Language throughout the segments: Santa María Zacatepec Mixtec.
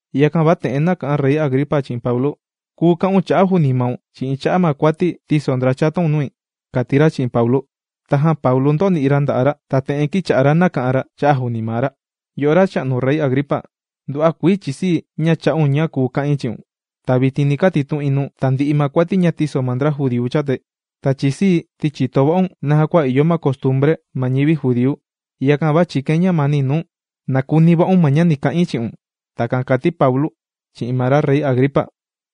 Yakan va te'en nāka'an Rey Agripa chi'in Paulu: ―¡Kùu ka'un cha'a' juuni maun chi'in cha'a' ma kuati tīso ndra chataun nui! ―kàti ra chi'in Paulu. Tajan Paulu ndōni'i ra nda'a' ra ta te'en kīcha'a ra nàka'an ra cha'a' juuni maa ra: ―Yo'o racha'nu Rey Agripa, nduva'a kuii chìsii̱ ña chā'un ña kùu ka'in chi'un. Ta vitin ni katitu'in nuu̱n tandi'i ma kuati ña tīso ma ndra judíu chatai. Ta chìsii̱, ti chìto va'un naja kua ìyo ma costumbre ma ñivi judíu. Yakan va chìkain ñamani nuu̱n na kuni va'un ma ña ni ka'in chi'un. ―Takan kàti Paulu chi'in ma Rey Agripa.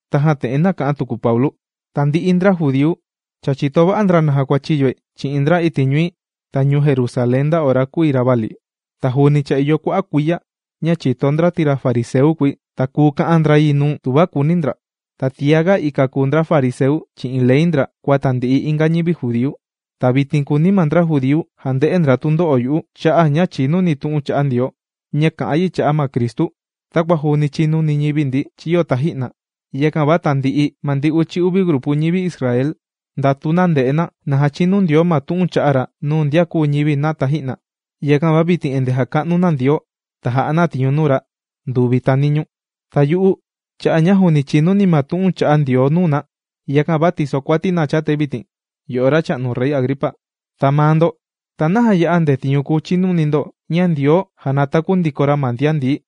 Tajan te'en nāka'an tuku Paulu: ―Tandi'i ndra judíu cha chìto va'a ndra naja kua chīyoi chi'in ndra iti' ñui ta ñuu Jerusalén nda ora kūi ravali. Ta juuni cha ìyo kua'a' kuiya ña chìto ndra ti ra fariseu kùi, ta kùu ka'an ndra yi nuu̱n tuva kùuni ndra. Ta tiaga ika kùu ndra fariseu chi'in ley ndra kua tandi'i inga ñivi judíu. Ta vitin kùuni ma ndra judíu jande'e ndra tundo'o yu'u cha'a' ña chìnuni̱ tu'un chà'a Ndioo ña kà'an yi cha'a' ma Cristu takua juuni chīnuni ñivi ndi chīyo taji'na. Yakan va tandi'i ma ndi uchi uvi grupu ñivi Israel ndàtu na nde'e na, na jachinu Ndioo ma tu'un chā'a ra nuu ndian kūu ñivi na taji'na. Yakan va vitin endee jàka'nu na Ndioo ta jà'a na tiñu nuu ra nduvi ta niñuu. Ta yu'u cha'a' ña juuni chìnuni̱ ma tu'un chà'a Ndioo nuu na, yakan va tìsokuati na chatai vitin, yo'o racha'nu Rey Agripa. Ta maa ndo, ¿ta naja ya'a ndetiñu kùu chinuni ndo ña Ndioo jànataku ndiko ra ma ndian ndií?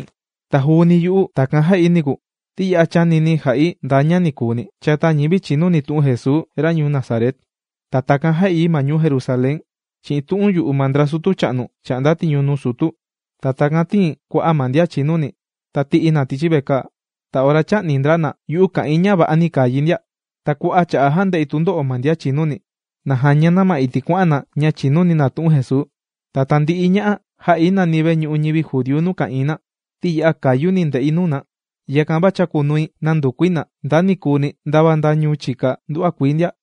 ’Ta juuni yu'u takan jà'i niku, ti ya'a chānini̱ ja'i nda ña nikuuni chata ñivi chìnuni tu'un Jesuu, ra ñuu Nazaret. Ta takan jā'i yi ma ñuu Jerusalén chi'in tu'un yu'u ma ndra sutu cha'nu chà'nda tiñu nuu sutu. Ta takan tīi̱n kua'a' ma ndian chìnuni ta tī'i̱ na tichi vekaa. Ta ora chā'ni ndra na, yu'u kā'in ña va'ani kàa yi ndia. Ta kua'a' cha'a' jānde'i tundo'o ma ndian chìnuni, na jaña na ma iti' kuà'an na ña chìnuni na tu'un Jesuu. Ta tandi'i ña'a, jā'i nani veñu'u ñivi judíu nuu ka'ìin na. Ti ya'a kayuni̱ nde'i nuu na. Yakan va chākunui nàndukui na nda nikuuni, ndava nda ñuu chika nduva'a kuii ndia.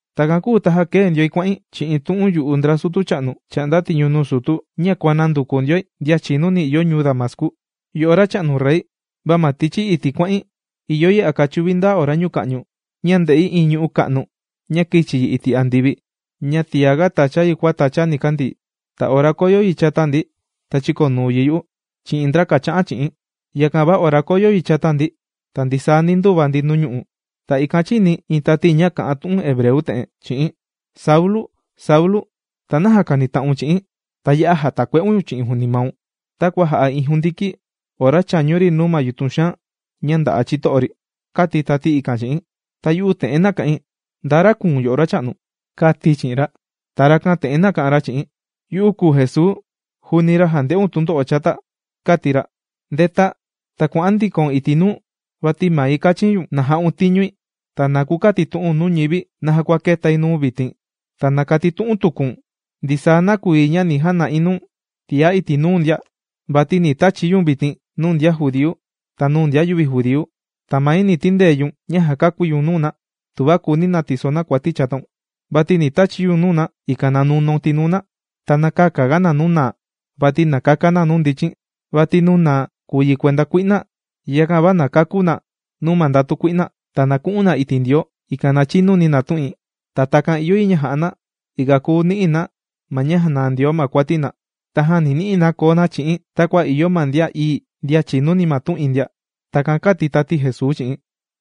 ’Takan kūu ta kēe ndioi kuà'in chi'in tu'un yu'u ndra sutu cha'nu chà'nda tiñu nuu sutu, ña kuànanduku ndioi ndian chìnuni ìyo ñuu Damascu. Yo'o racha'nu rey, va ma tichi iti' kuà'in ìyo yi a kachuvi ndaa ora ñuka'ñu ña ndē'i iin ñu'ú ka'nu ña kīchi yi iti' andivi ña tiaga tācha yi kua tàcha nikandii. Ta ora kōyo yi chata ndi, ta chīkonuu yi yu'u chi'in ndra kàcha'an chi'i̱n. Yakan va ora kōyo yi chata ndi, ta ndisaa ndi ndūva ndi nuu ñu'u'. Ta ikan chīni̱ iin tati ña kà'an tu'un hebreu te'en chi'i̱n: “Saulu, Saulu, ¿ta naja kànita'un chi'i̱n? Ta ya'a jàtakue'un ñu̱n chi'in juuni maun, takua jà'a iin jundiki ora chàñu ri nuu yutun xaan ña ndà'a ma chito'o ri”, kāti tati ikan chi'i̱n. Ta yu'u te'en nāka'in: “¿Nda ra kùu̱n yo'o, Racha'nu?”, kāti̱ chi'in ra. Ta rakan te'en nāka'an ra chi'i̱n: “Yu'u kùu Jesuu, juuni ra jànde'un tundo'o chata”, kāti ra. “Ndeta ta kua'an ndiko iti' nuu, vati mai kāchi̱n ñu̱n na ja'un tiñui, ta na kukatitu'u̱n nuu ñivi naja kua kētai nuu̱n vitin, ta na katitu'un tuku̱n ndisaa nakuyi ña ni jana'i nuu̱n tiá iti' nuu ndia. Vati ni tachi̱ ñu̱n vitin nuu ndian judíu, ta nuu ndian yüvi judíu. Ta mai ni tindee ñu̱n ña jàkakúi ñu̱n nuu na, tuva kùuni na tiso na kuati chataun. Vati ni tachi̱ ñu̱n nuu na, ikan na nunaun tinuu na, ta na käkaga na nuu naa, vati na kaka na nuu ndichin. Vati nuu naa kùu yi kuenda kui'na, yakan va na kakú na nuu ma ndatu kui'na. Ta na ku'un na iti' Ndioo, ikan na chinuni na tu'in. Ta takan ìyo yi ña ja'a na ikan kùu ni'i na ma ña jànaa Ndioo ma kuati na. Tajan ni ni'i na koo na chi'i̱n takua ìyo ma ndian ií ndian chìnuni ma tu'in ndia.” Takan kāti tati Jesuu chi'i̱n.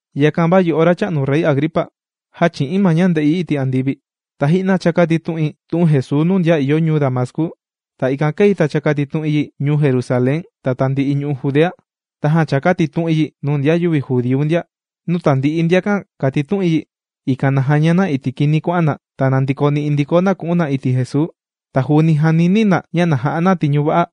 ’Yakan va yo'o racha'nu Rey Agripa, jāchi'i̱n ma ña ndē'i iti' andivi. Taji'na chākatitu'in tu'un Jesuu nuu ndian ìyo ñuu Damascu, ta ikan kēi ta chākatitu'in yi ñuu Jerusalén ta tandi'i ñu'u' Judea. Tajan chākatitu'in yi nuu ndian yüvi judíu ndia. Nuu tandi'i ndiakan kàtitu'in yi, ikan na jaña na iti' kini kuà'an na, ta na ndikoni'i ndiko na ku'un na iti' Jesuu. Ta juuni jànini̱ na ña na ja'a na tiñu va'a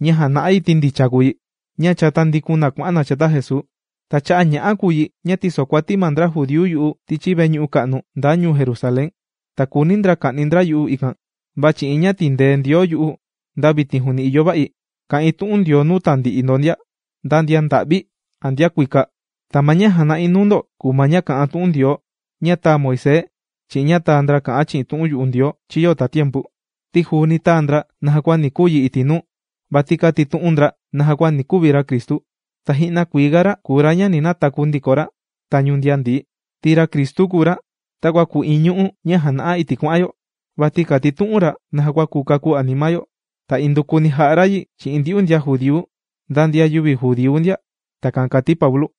ña jàna'a yi, ti ndicha kùu yi ña cha tāndikun na kuà'an na chata Jesuu. Ta cha'a' ña'a kùu yi ña tīsokuati ma ndra judíu yu'u tichi veñu'u ka'nu ndaa ñuu Jerusalén. Ta kùuni ndra ka'ni ndra yu'u ikan. Va chi'in ña tìndee Ndioo yu'u, nda vitin juuni ìyo va'i kà'in tu'un Ndioo nuu tandi'i ndo ndia, nda ndian nda'vi a ndian kuika. Ta ma ña jàna'i nuu ndo kùu ma ña kà'an tu'un Ndioo ña tāa Moisés chi'in ña tāa ndra kà'an chi'in tu'un yu'u Ndioo chīyo tatiempu. Ti juuni tāa ndra naja kua ni kuu yi iti' nuu. Vati kātitu'un ndra naja kua ni kuvi ra Cristu, ta ji'na kuii ga ra kùu ra ña ni nataku ndiko ra tañu ndian ndií. Ti ra Cristu kùu ra takua kùu iin ñu'ú ña jàna'a iti' kuà'an yo. Vati kàtitu'un ra naja kua kùu kakú anima yo. Ta indukuni jà'a ra yi chi'in ndyu'u ndian judíu nda ndian yüvi judíu ndia. ―Takan kàti Paulu.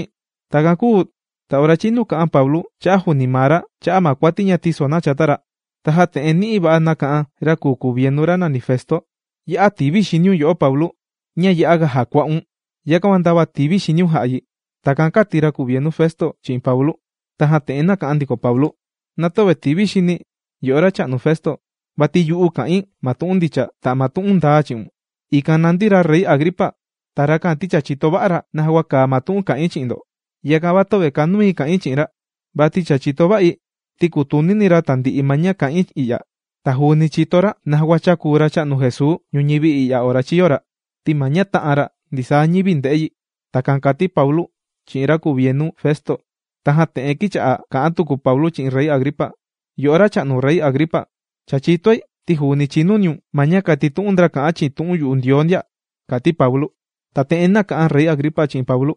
Takan kūu ta ora chīnu kā'an Paulu cha'a' juuni maa ra cha'a' ma kuati tīso na chata ra, tajan te'en ni'i va'a nāka'an ra kùu kuvienu ra nàni Festo: ―¡Ya'a tìvi xiniun, yo'o Paulu! Ña ya'aga jàkua'un, yakan va ndava tìvi xiniun jā'a yi. ―Takan kāti ra kuvienu Festo chi'in Paulu. Tajan te'en nāka'an ndiko Paulu: ―Na tüvi tìvi xini̱, yo'o racha'nu Festo. Vati yu'u, kà'in ma tu'un ndicha ta ma tu'un ndaa chi'un. Ikan nàndi ra Rey Agripa. Ta rakan ti cha chìto va'a ra naja kua kàa ma tu'un kà'in chi'in ndo. Yakan va töve kànui ka'in chi'in ra. Vati cha chìto va'i, ti kùtunini ra tandi'i ma ña kà'in i'ya. Ta juuni chìto ra naja kua chākuu Racha'nu Jesuu ñuñivi i'ya ora chīyo ra. Ti ma ña tā'an ra ndisaa ñivi ndē'e yi. ―Takan kàti Paulu chi'in ra kuvienu Festo. Tajan te'en kīcha'a kà'an tuku Paulu chi'in Rey Agripa: ―Yo'o racha'nu Rey Agripa. Cha chìtoi ti juuni chìnuniun ma ña kàtitu'un ndra kà'an chi'in tu'un yu'u Ndioo ndia ―kàti Paulu. Ta te'en nāka'an Rey Agripa chi'in Paulu: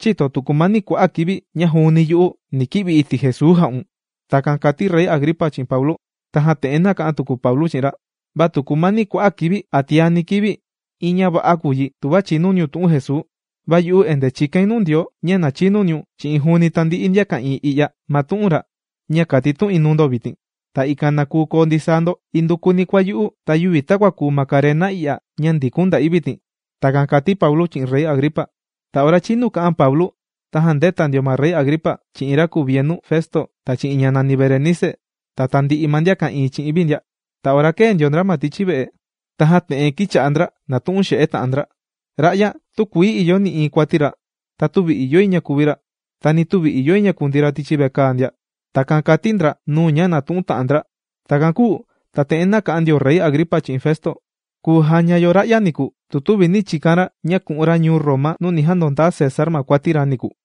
―¿Chïto tu kumani kua'a' kivi ña juuni yu'u ni ki'vi̱ iti' Jesuu jà'un? ―Takan kàti ra Rey Agripa chi'in Paulu. Tajan te'en nāka'an tuku Paulu chi'in ra: ―Va tu kumani kua'a' kivi a tiani kivi, iin ña va'a kùu yi tuva chinuniun tu'un Jesuu. Va yu'u endee chìkain nuu Ndioo ña na chinuniun chi'in juuni tandi'i ndian ka'ìin i'ya, ma tu'un ra ña kàtitu'in nuu ndo vitin. Ta ikan na kuu koo ndisaa ndo indukuni kua yu'u, va yüvi takua kùu ma karena i'ya ña ndikun nda'i vitin. ―Takan kàti Paulu chi'in Rey Agripa. Ta ora chinu kā'an Paulu, tajan ndēta ndio ma ra Rey Agripa chi'in ra kuvienu Festo, ta chi'in ña nàni Berenice, ta tandi'i ma ndian ka'ìin chi'in vi ndia. Ta ora kēe ndio ndra ma tichi ve'e, tajan te'en kīcha'a ndra nàtu'un xe'e ta'an ndra: ―Ra'ya, tükuii ìyo nï'iin kuati ra. Ta tüvi ìyo yi ña kuvi ra. Ta ni tüvi ìyo yi ña kundii ra tichi vekaa ndia. ―Takan kàti ndra nuu ña nàtu'un ta'an ndra. Takan kūu ta te'en nāka'an ndio ra Rey Agripa chi'in Festo: ―Kùu jaña yo ra'ya niku, tu tüvi nī chikan ra ña ku'un ra ñuu Roma nuu ni jandondaa César ma kuati ra niku.